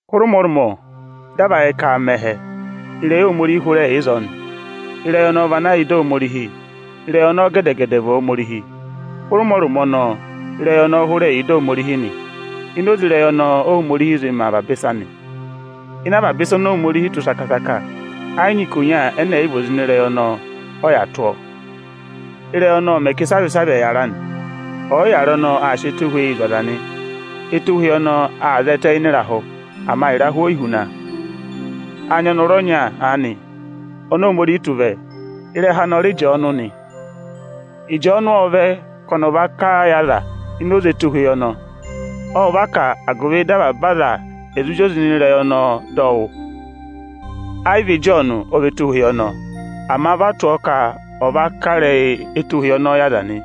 Hụrẹ ụmọrụmọ, dị a va yẹ ka aa mẹ ẹhẹ, Ịrẹyị Ohomorihi hụrẹ yà ịzọọ nị. Ịrẹyị ọnọọ vị ana yà ịdị Ohomorihi, Ịrẹyị ọnọọ gẹdẹ-gẹdẹ vị Ohomorihi. Hụrẹ ụmọrụmọ ọnọọ, Ị́rẹyị ọnọọ hụrẹ yà ịdị Ohomorihi nị. Ini oze Ịrẹyị ọnọọ Óhomorihi zị mẹ avaba ịsa nị. Ịnị avaba ịsa oni Ohomorihi tụ́ saka-saka ẹ yị nyị ikonya ẹnẹ ẹ̀ yị vị ini oze Ịrẹyị ọnọọ ọ yà tụ́ ọọ. Ịrẹyị ọnọọ ọ mẹ ka ịsavị-ịsavị ẹ̀ yàra nị. Ọyịyàra ọnọọ aa sị ẹtohweyi zụ̀ aza nị. Etohweyi ọnọọ aa zẹtẹ ịnị ịrahụ, ama ịrahụ o yi huna a. Â nyị ọnọrụ ọnya aanị, oni Ohomorihi tụ́ vẹ. Ịrẹha anị ọ rị Ịjọọnụ nị. Ịjọọnụ ộ vẹ ka ọnị ọ̀ dọ ivenu yị aza ini oze Etohweyi ọnọọ. Ọ va kà a, agụvị dị avaba aza ẹ̀ zụ zị oze ịnị ụvọ anị dọ ọ wụ́. Ẹ yị vị Ịjọọnụ ọ vị Etohweyi ọnọọ, ama vị a tụ́ ọ ka ọ̀ dọ ivenu ịrẹyị Etohweyi ọnọọ yị aza nị.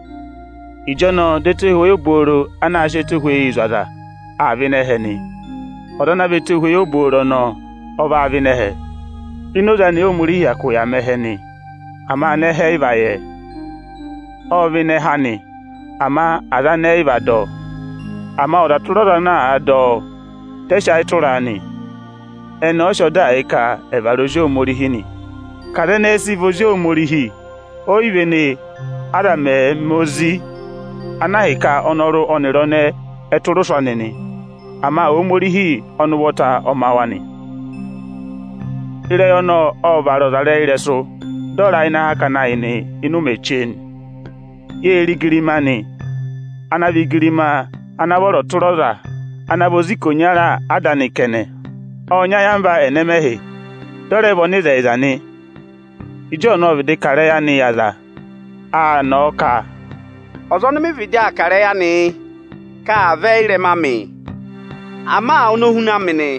Etohweyi obooro ana aa sị ẹtohweyi zụ̀ aza, aa vẹ ịnị ẹhẹ, Ọza ana vị Etohweyi obooro ọnọọ ọ vavẹ ịnị ẹhẹ; ini oze anị Óhomorihi hyakụ yà mẹ ẹhẹ nị, ama anẹhẹ ẹ yị va yẹ ẹ. Ộ vẹ ịnị ẹkụra anị, ama aza anị ẹ yị va dọ ọ. Ama ọza tụra ọza ana àa dọ ọ, dị ẹ sị ayị tụra a nị, ẹnị ọọ̄ sị ọdaa yị ka ẹ̀ vara ezi Ohomorihi nị. Ka aza ẹnẹẹ ẹ sị vị ezi Ohomorihi o yi véné, aza mẹ̀ẹ̄ ma ezi ana ahịka ọnọrụ ọnịrị ọnẹẹ ẹ tụra ụsụ anị nị. Ama Ohomorihi ọnị ụvọta ọ ma wa nị. Ịrẹyị ọnọọ ộ vara ọzarẹyịrẹsụ, dị ọ ra ịnị akakana ayị yị ụmẹ chee nị. Yê re igirima anị ana vị igirima ana vọrọ tụra ọza ana vị ozi ikonya Ada anị kẹnẹ. Ộ nyị ayamva ẹnẹmẹhị, dị ọ rẹ vị ọnịzẹyịza nị. Ịjọọnụ ộ vịdị kà ịrẹyị anị yị aza. Aa nọọ ka, “Ọza ọnị mị vịdị aa kà ịrẹyị anị yị, ka aa vẹ ị́rẹma amị, ama ọnị o huna mị nị,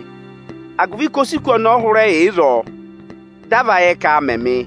agụvị ka o si kù ọnị ọnị hụrẹ yà ịzọọ, dị a va yẹ ka aa ma mị.”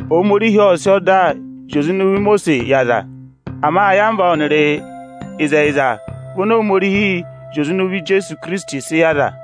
Ohomorihi ộ sị ọda zị oze ịnị ụvọ Imosiisi yị aza; ama ayamva ọnịrị ịzẹyịza vị oni Ohomorihi zị oze ịnị ụvọ Ijeesu Ikirisiti sị yị aza.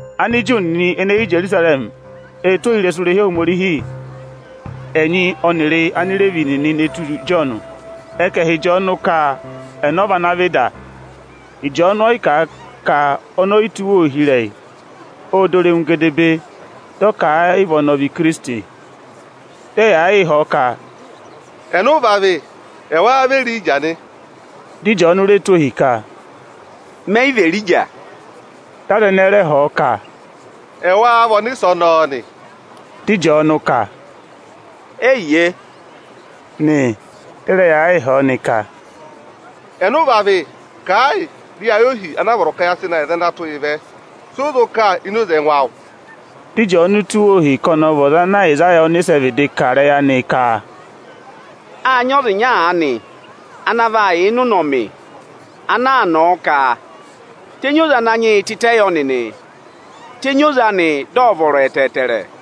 Aniju nịnị ene hi Ijerusarẹmị ệ tụ́ ohirẹsụ irehi Ohomorihi ẹnyị ọnịrị Anireevi nịnị ne tù Ịjọọnụ. Ẹ ka ẹ̀ họ̀ Ịjọọnụ ka ẹnẹ ọ vị ana vị da. Ịjọọnụ ọ yị kà a ka ọnị ọ yị tụ́ ohi ịrẹyị, ộ dọ irenu gedebee, dị ọ ka ẹ yị vị ọnị ọ vị Ikirisiti! Dị ẹ yaa yịị họ̀ ọ ka, “Ẹnị ụ va vị? Ẹ wáá vị Erija nị?” Dị Ịjọọnụ re tụ́ ohi ka, “Mẹ yị vị Erija!” Dị aza ẹnẹẹ rẹ họ̀ ọ ka, “Ẹ wáá vị Ọnịsẹ ọnọọ nị?” Dị Ịjọọnụ kà: “Eyiye” nị. Dị ẹ rẹ yaa yịị họ̀ ọ nị ka, “Ẹnị ụ va vị? Kà ẹ yị, dị ya yẹ ohi ana a vọrọ ka ya sị na yị aza ana tụ́ yị vẹ. Sị ụ zụ kà ini oze ẹngụ awụ?” Dị Ịjọọnụ tụ́ wa ohi ka ọnị ọ vị ọza ana Ayịsaya ọnịsẹ vịdị kà ịrẹyị anị ka, “Â nyị ọza ịnya aanị ana vaa yà ịnị ụnọmị ana aa nọọ ka: ‘Tenyi oze Ananyị yị tịtẹ yọ nịnị, tenyi oze anị, dị ọ̀ vọrọ ẹtẹẹtẹrẹ!’”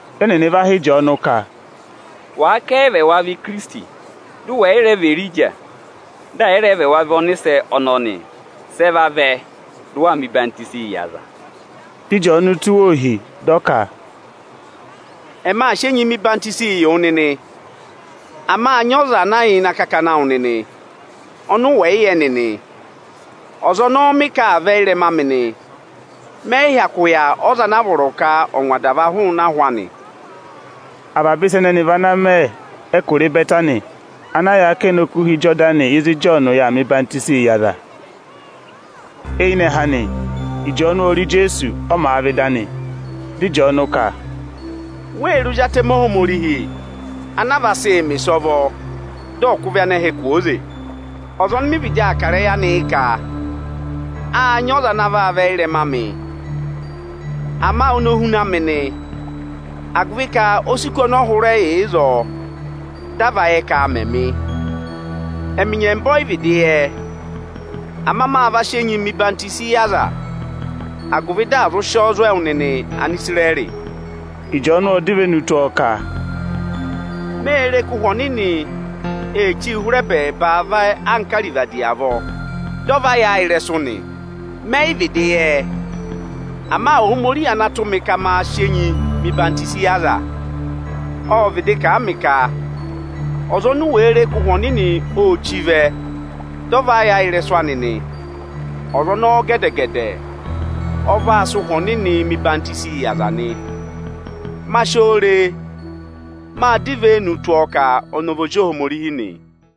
Dị ẹnịnị va họ̀ Ịjọọnụ kà: “Wàa ka ẹ yị vị ẹwa vị Ikirisiti, dị ụ wẹ̀ yị rẹ vị Erija, dị ẹ̀ yị rẹ vị ẹwa vị Ọnịsẹ ọnọọ nị, sị ẹ vavẹ dị ụ wa hụ́ aza enyi ẹdọwụ?” Dị Ịjọọnụ tụ́ wa ohi, dị ọ ka, “Ẹmị aa sị enyi mẹ ọyịhwenyii yị wụ nịnị; ama â nyị ọza ana yà ịnị akakana awụ nịnị, ọnị ụ wẹ̀ yị yẹ nịnị. Ọza ọnọọ mị ka aa vẹ ị́rẹma amị nị; mẹ yị hyakụ yà ọza ana a vọrọ ka ọ̀ ngwa adava hụụnị ahụ anị.” Avaba ịsa ẹnẹnị vị ana mẹ ẹkụra Ịbẹtanị, ana yà akẹnẹ Okuha Ịjọdanị ịzị Ịjọọnụ yà aa mẹ ọyịhwenyii yị aza. Eyinẹhẹ anị, Ịjọọnụ ô re Ijeesu, ọ màa vẹ ịdị anị. Dị ịjọọnụ ka, “Wee re Ozi Atẹmẹ Ohomorihi ana a vaa sị mẹ̀ ịsọvọ dị ọ̀ kụ̀ ịvị anẹhẹ kwooze! Ọza ọnị mị vịdị aa kà ịrẹyị anị yị ka: ‘Â nyị ọza ana aa vẹ ị́rẹma amị; ama oni o huna mị nị, agụvị ka o si kù ọnị ọ hụrẹ yà ịzọọ dị a va yẹ ka aa ma mị.’ Ẹmị nyẹmba ẹ yị vịdị yẹ ẹ; ama ma va sị enyi mẹ̀ ọyịhwọzenyi yị aza, agụvị dị à zụ sị ọọ zụ̀ ẹwụ nịnị Anisirẹrị.” Ịjọọnụ ộ dọ ivenu tụ́ ọọ ka, “Mê re ka Ụhwẹ Ọnịnị ee chíi hụrẹ ẹbẹẹba vẹ anka arivadi avọọ, dị ọ va yà a ịrẹsụ nị. Mẹ yị vịdị yẹ ẹ, ama Ohomorihi ana tụ́ mị ka maa sị enyi mẹ ọyịhwenyii yị aza, ộ vịdị kà a mị ka, ‘Ọza oni u wèe re ka Ụhwẹ Ọnịnị ô chí vẹ, dị ọ va yà ịrẹsụ anị nị, ọza ọnọọ gẹdẹ-gẹdẹ ọ vaa sị Ụhwẹ Ọnịnị hụ̀ aza mẹ enyi nị.’ Ma si oo re, mâ dọ ivenu tụ́ ọọ ka ọnị ọ vị Ozi Ohomorihi nị.”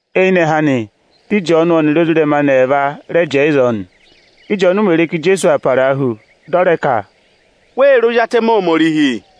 Eyinẹhẹ anị, dị Ịjọọnụ ọnịrị ezirẹma anị ẹẹva rẹ jẹẹ ịzọọ nị. Ị́jọọnụ mè re ka Ijeesu aa parahu, dị ọ rẹ ka, “Wee re Ozi Atẹmẹ Ohomorihi!”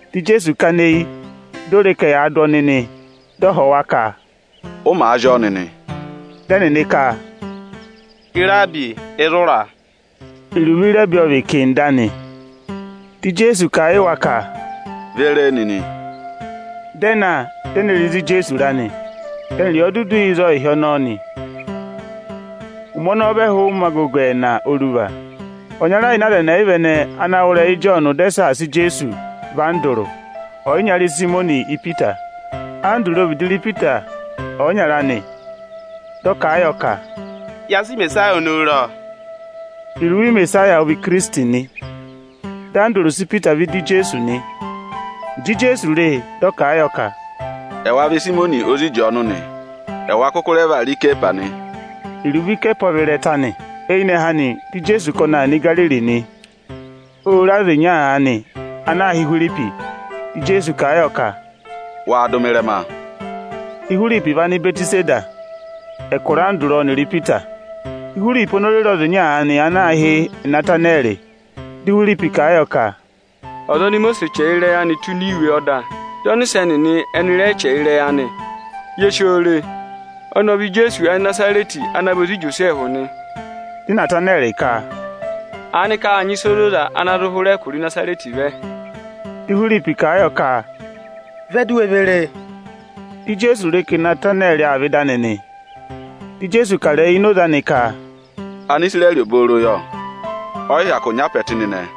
Dị Ijeesu kana eyi, di o re ka ẹyaa dụ ọnịị vẹ nị. Ộ họ̀ wa ka, “Si u wee sì nịnị?” Dị ẹnịnị ka, “Iraabi, ịzị ụ ra?” (Iruvo “Iraabi” ọ vị “Iticha”.) Dị Ijeesu kà a yị wa ka, “Ve re e nịnị!” Dị ẹ na, di e ne re ịzị Ijeesu ra nị, dị ẹnị rị ọ dudu yà ịzọọ ịhị ọnọọ nị. Ụmẹ ọnọọ vị ẹhụụ ụmẹ agogo ẹẹna oruva. Ọnyara ịnị aza ẹyịva ẹnẹẹ ana wụ́ ịrẹyị Ịjọọnụ dị ẹ saasa Ijeesu, vị Andụrụ, ọyịnyara Ịsayịmọnị Ipita. Andụrụ ộ vịdị ne sì Ịsayịmọnị ọyịnyara anị. Dị ọ kà a yọ ka, “Ya sị Imesaya ọnọọ re, ọ!” Iruvo Imesaya ọ vị Ikirisiti nị. Dị Andụrụ sị Ipita vẹ ịdị Ijeesu nị. Ịjị Ijeesu re e, dị ọ kà a yọ ka, “Ẹ wa vị Ịsayịmọnị ozi Ịjọọnụ nị. Ẹwa kụkụ rẹ vaa rị Ikehwasi nị.” (Iruvo “Ikehwasi” ọ vị “ịrẹta” nị.) Eyinẹhẹ anị, dị Ijeesu ka ọnị aa nọ Igariri nị. Ô re ọza ịnya aanị ana aā hị́ Ihwiripi. Dị Ijeesu kà a yọ ka, “Waa dụ mị ịrẹma!” Ihwiripi vị Anịbẹtịsayịda, ẹkụra Andụrụ ọnịrị Ipita. Ihwiripi oni o re re ọza ịnya aanị ana aā hị́ Inatanẹrị. Dị Ihwiripi kà a yọ ka, “Ọza oni Imosiisi chẹrẹ ịrẹyị anị tụ́ ini iwe ọda, dị ọnịsẹ nịnị ẹnị rẹ chẹrẹ ịrẹyị anị, ye si o re. Ọnị ọ vị Ijeesu Anịnazarẹtị, ana vị ozi Ijosẹẹhụ nị.” Dị Inatanẹrị ka, “Aanịka â nyị ịsa ozoza ana zụ hụrẹ ẹkụra Ịnazarẹtị vẹ?” Di Ihwiripi kà a yọ ka, “Vẹ, di u we ve re e!” Ịjị Ijeesu re ka Inatanẹrị aa vẹ ịda anị, di Ijeesu kà ịrẹyị ini oze anị ka, “Anisirẹrị obooro yọ! Ọnịzẹyịza obooro ọ vị̀ nị.”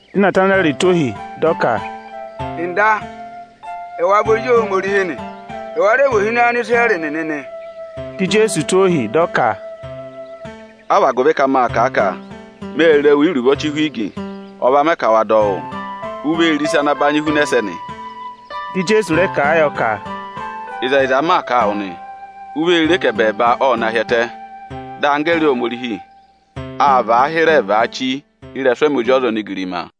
Dị Inatanẹrị tụ́ ohi, dị ọ ka, “Ọga, ẹwa vị Ozi Ohomorihi nị. Ẹ wa rẹ vị Ohinọyị Anisirẹrị nịnị nị.” Dị Ijeesu tụ́ ọọ ohi, dị ọ ka, “A vị agụvị ka mâ kà a ka mê re wu íruvo ọchị ihwigi, ọ va mẹ ka wa dọ wụ́? U vee re ịsa ana banyị huna ẹsẹnị.” Dị Ijeesu rẹ kà a yọ ka, “Ịzẹyịza m maa kà a wụ nị: U vee re ka ẹbẹẹba ộ na hi ẹtẹ, dị anggẹẹrị Ohomorihi aa vaa hịrẹẹ vaachi ịrẹsụ ẹmị Ozi ọza onigirima.”